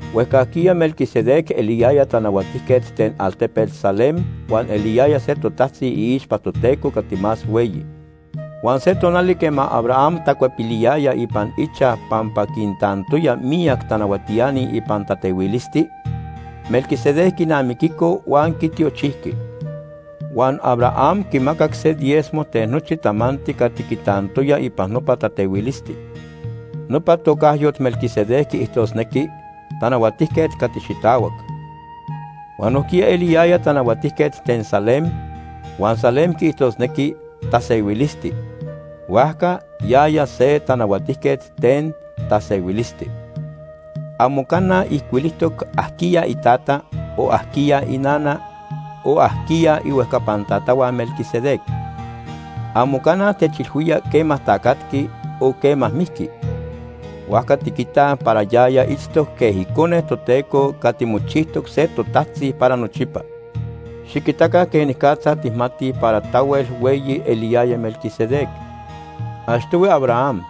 Huejcajquiya Melquisedec eliyaya tanahuatijquet ten altepet Salem huan eliyaya se totajtzi iixpa Toteco Cati Más Hueyi. Huan se tonali quema Abraham tacuepiliyaya ipan ichaj pampa quintantoya miyac tanahuatiani ipan tatehuilisti, Melquisedec quinamiquico huan quitiochijqui. Huan Abraham quimacac se diezmo ten nochi tamanti cati quitantoya ipan nopa tatehuilisti. Nopa tocayot, Melquisedec, quiijtosnequi “Tanahuatijquet Cati Xitahuac.” Huan nojquiya eliyaya tanahuatijquet ten Salem, huan Salem quiijtosnequi “Tasehuilisti.” Huajca yaya se “Tanahuatijquet Ten Tasehuilisti.” Amo cana ijcuilijtoc ajquiya itata, o ajquiya inana, o ajquiya ihuejcapan tatahua Melquisedec. Amo cana techilhuía quema tacatqui o quema mijqui. Huajca tiquitaj para yaya itztoc quej Icone Toteco cati mochijtoc se totajtzi para nochipa. Xiquitaca quenicatza tijmatij para tahuel hueyi eliyaya Melquisedec. Achtohui Abraham,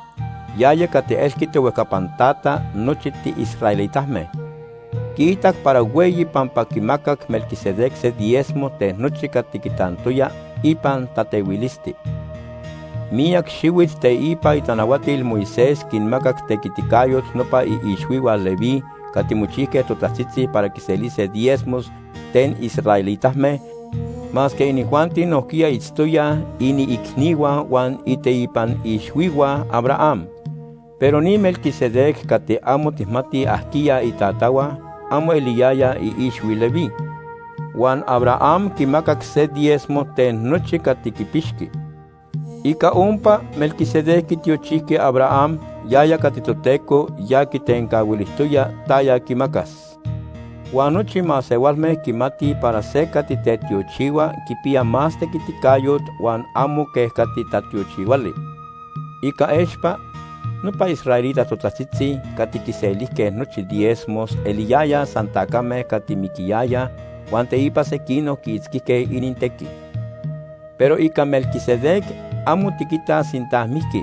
yaya cati elqui tohuejcapan tata nochi tiisraelitame, quiitac para hueyi pampa quimacac Melquisedec se diezmo ten nochi cati quitantoya ipan tatehuilisti. Miyac xihuit teipa itanahuatil Moisés quinmacac tequiticayot nopa iixhuihua Leví cati mochijque totajtzitzi para quiselise diezmos ten israelitame masque inijuanti nojquiya itztoyaj iniicnihua huan iteipan ixhuihua Abraham. Pero ni Melquisedec cati amo tijmatij ajquiya itatahua amo eliyaya iixhui Leví, huan Abraham quimacac se diezmo ten nochi cati quipixqui. Ica ompa, Melquisedec quitiochijqui Abraham, yaya cati Toteco ya quitencahuilijtoya taya quimacas. Huan nochi masehualme quimatij para se cati tetiochihua quipiya más tequiticayot huan amo quej cati tatiochihuali. Ica expa, nopa israelita totajtzitzi cati quiselijque nochi diezmos eliyayaj san tacame cati miquiyayaj huan teipa sequinoc quiitzquijque inintequi. Pero ica Melquisedec amo tiquitaj sinta mijqui,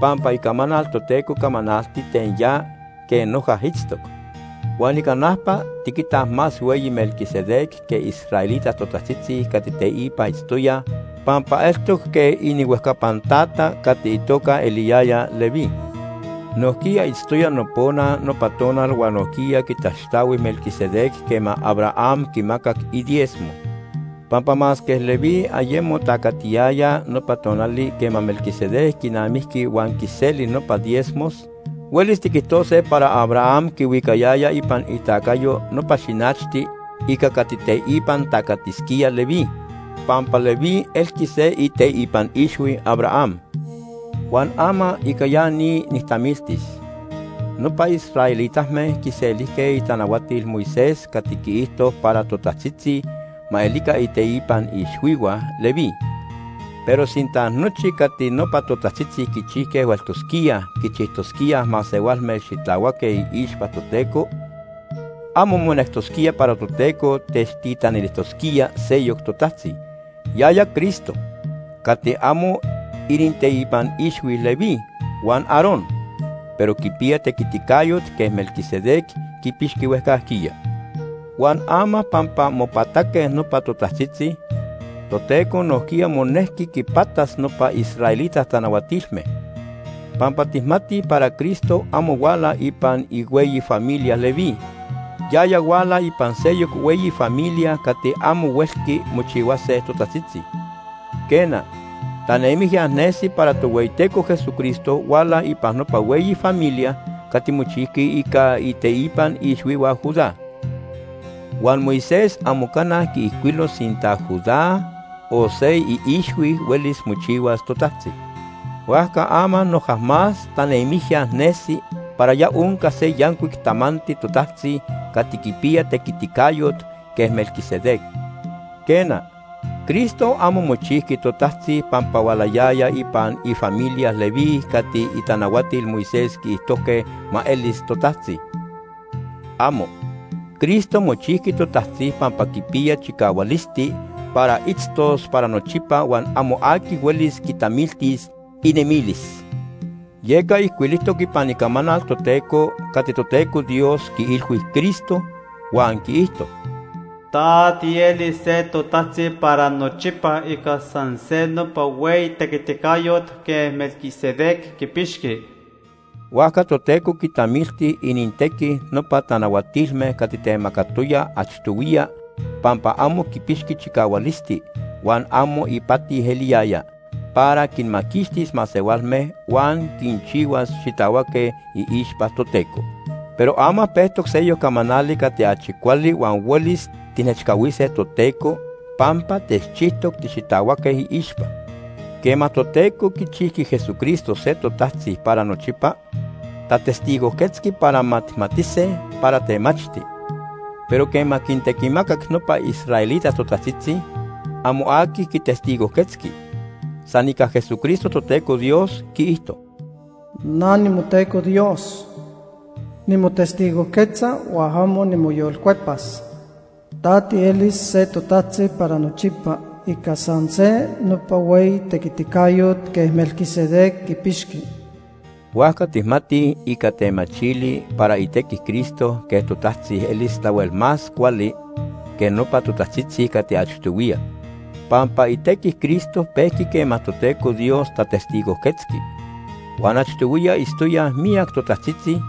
pampa Icamanal Toteco camanalti ten ya quej noja itztoc. Huan ica najpa, tiquitaj más hueyi Melquisedec que israelita totajtzitzi cati teipa itztoyaj pampa eltoc quej inihuejcapan tata cati itoca eliyaya Leví, nojquiya itztoya nopona nopa tonal huan nojquiya quitaxtahui Melquisedec quema Abraham quimacac idiezmo. Pampa masque Leví ayemo tacatiyaya nopa tonali quema Melquisedec quinamijqui huan quiseli nopa diezmos, huelis tiquijtose para Abraham quihuicayaya ipan itacayo nopa xinachti ica cati teipa tacatisquía Leví, pampa Leví elqui se iteipan ixhui Abraham. Huan ama ica ya ni nijtamiltis. Nopa israelitame quiselijque itanahuatil Moisés cati quiijto para totajtzitzi ma elica iteipan ixhuihua Leví. Pero sinta nochi cati nopa totajtzitzi quichijque hueltosquía quinchijtosquía masehualme xitahuaque iixpa Toteco, amo monectosquía para Toteco techtitanilijtosquía seyoc totajtzi, yaya Cristo, cati amo ininteipan ixhui Leví huan Aarón, pero quipiya tequiticayot quej Melquisedec quipixqui huejcajquiya. Huan ama pampa mopataque nopa totajtzitzi, Toteco nojquiya monejqui quipatas nopa israelita tanahuatilme, pampa tijmatij para Cristo amo huala ipan ihueyi familia Leví. Yaya huala ipan seyoc hueyi familia cati amo huelqui mochihuase totajtzitzi. Quena, tanemijya nesi para Tohueyiteco Jesucristo huala ipan nopa hueyi familia cati mochijqui ica iteipan ixhuihua Judá. Huan Moisés amo cana quiijcuilo sinta Judá o se iixhui huelis mochihuas totajtzi. Huajca ama noja más tanemijya nesi para ya onca se yancuic tamanti totajtzi cati quipiya tequiticayot quej Melquisedec. Quena, Cristo amo mochijqui totajtzi pampa hualayaya ipan ifamilia Leví cati itanahuatil Moisés quiijtojque ma elis totajtzi. ¡Amo! Cristo mochijqui totajtzi pampa quipiya chicahualisti para itztos para nochipa huan amo aqui huelis quitamiltis inemilis, yeca ijcuilijtoc ipan Icamanal Toteco cati Toteco Dios quiilhui Cristo, huan quiijto: “Ta tielis se totajtzi para nochipa ica san se nopa hueyi tequiticayot quej Melquisedec quipixqui.” Huajca Toteco quitamilti inintequi nopa tanahuatilme cati temacatoya achtohuiya pampa amo quipixqui chicahualisti, huan amo ipati eliyaya para quinmaquixtis masehualme huan quinchihuas xitahuaque iixpa Toteco. Pero ama pejtoc seyoc camanali cati achi cuali huan huelis tijnechcahuise Toteco pampa techchijtoc tixitahuaque iixpa. Quema Toteco quichijqui Jesucristo se totajtzi para nochipa, tatestigojquetzqui para ma tijmatise para temachti, pero quema quintequimacac nopa israelita totajtzitzi, amo aqui quitestigojquetzqui. San ica Jesucristo Toteco Dios quiijto: “Na nimoTeco Dios. Nimotestigojquetza huan amo nimoyolcuepas: ‘Ta tielis se totajtzi para nochipa ica san se nopa hueyi tequiticayot quej Melquisedec quipixqui.’” Huajca tijmatij ica temachili para itequi Cristo quej totajtzi elis tahuel más cuali que nopa totajtzitzi cati achtohuiya, pampa itequi Cristo pejqui quema Toteco Dios tatestigojquetzqui. Huan achtohuiya itztoyaj miyac totajtzitzi,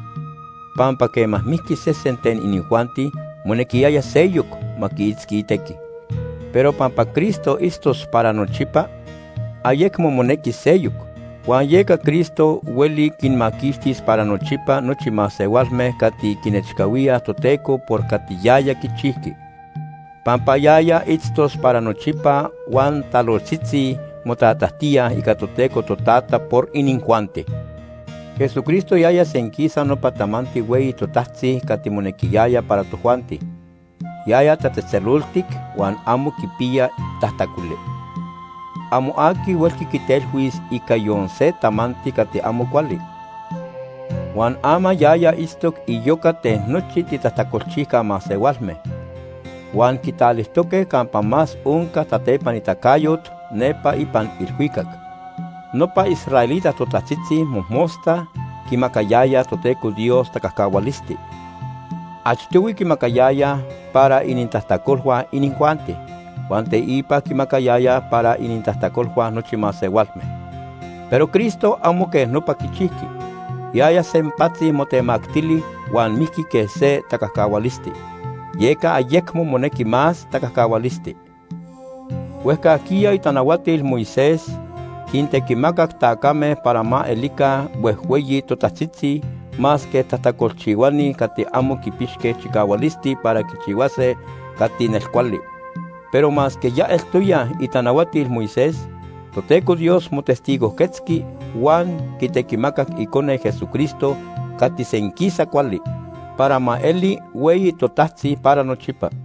pampa quema mijqui sese ten inijuanti, monequiyaya seyoc ma quiitzqui itequi. Pero pampa Cristo itztos para nochipa, ayecmo monequis seyoc. Huan yeca Cristo hueli quinmaquixtis para nochipa nochi masehualme cati quinechcahuíaj Toteco por cati yaya quichijqui, pampa yaya itztos para nochipa huan talojtzitzi motatajtía ica Toteco Totata por inijuanti. Jesucristo yaya senquisa nopa tamanti hueyi totajtzi cati monequiyaya para tojuanti. Yaya tatzejtzeloltic huan amo quipiya tajtacoli. Amo aqui huelqui quitelhuis ica yon se tamanti cati amo cuali. Huan ama yaya itztoc iyoca ten nochi titajtacolchijca masehualme, huan quitalijtoque campa más onca tatepanitacayot nepa ipan ilhuicac. Nopa israelita totajtzitzi mojmosta quimacayayaj Toteco Dios tacajcahualisti. Achtohui quimacayayaj para inintajtacolhua inijuanti, huan teipa quimacayayaj para inintajtacolhua nochi masehualme. Pero Cristo amo quej nopa quichijqui. Yaya sempatzi motemactili huan mijqui quej se tacajcahualisti, yeca ayecmo monequi más tacajcahualisti. Huejcajquiya itanahuatil Moisés quintequimacac tacame para ma elica huejhueyi totajtzitzi masque tajtacolchihuani cati amo quipixque chicahualisti para quichihuase cati nelcuali. Pero masque ya eltoyaj itanahuatil Moisés, Toteco Dios motestigojquetzqui huan quitequimacac Icone, Jesucristo cati senquisa cuali, para ma eli hueyi totajtzi para nochipa.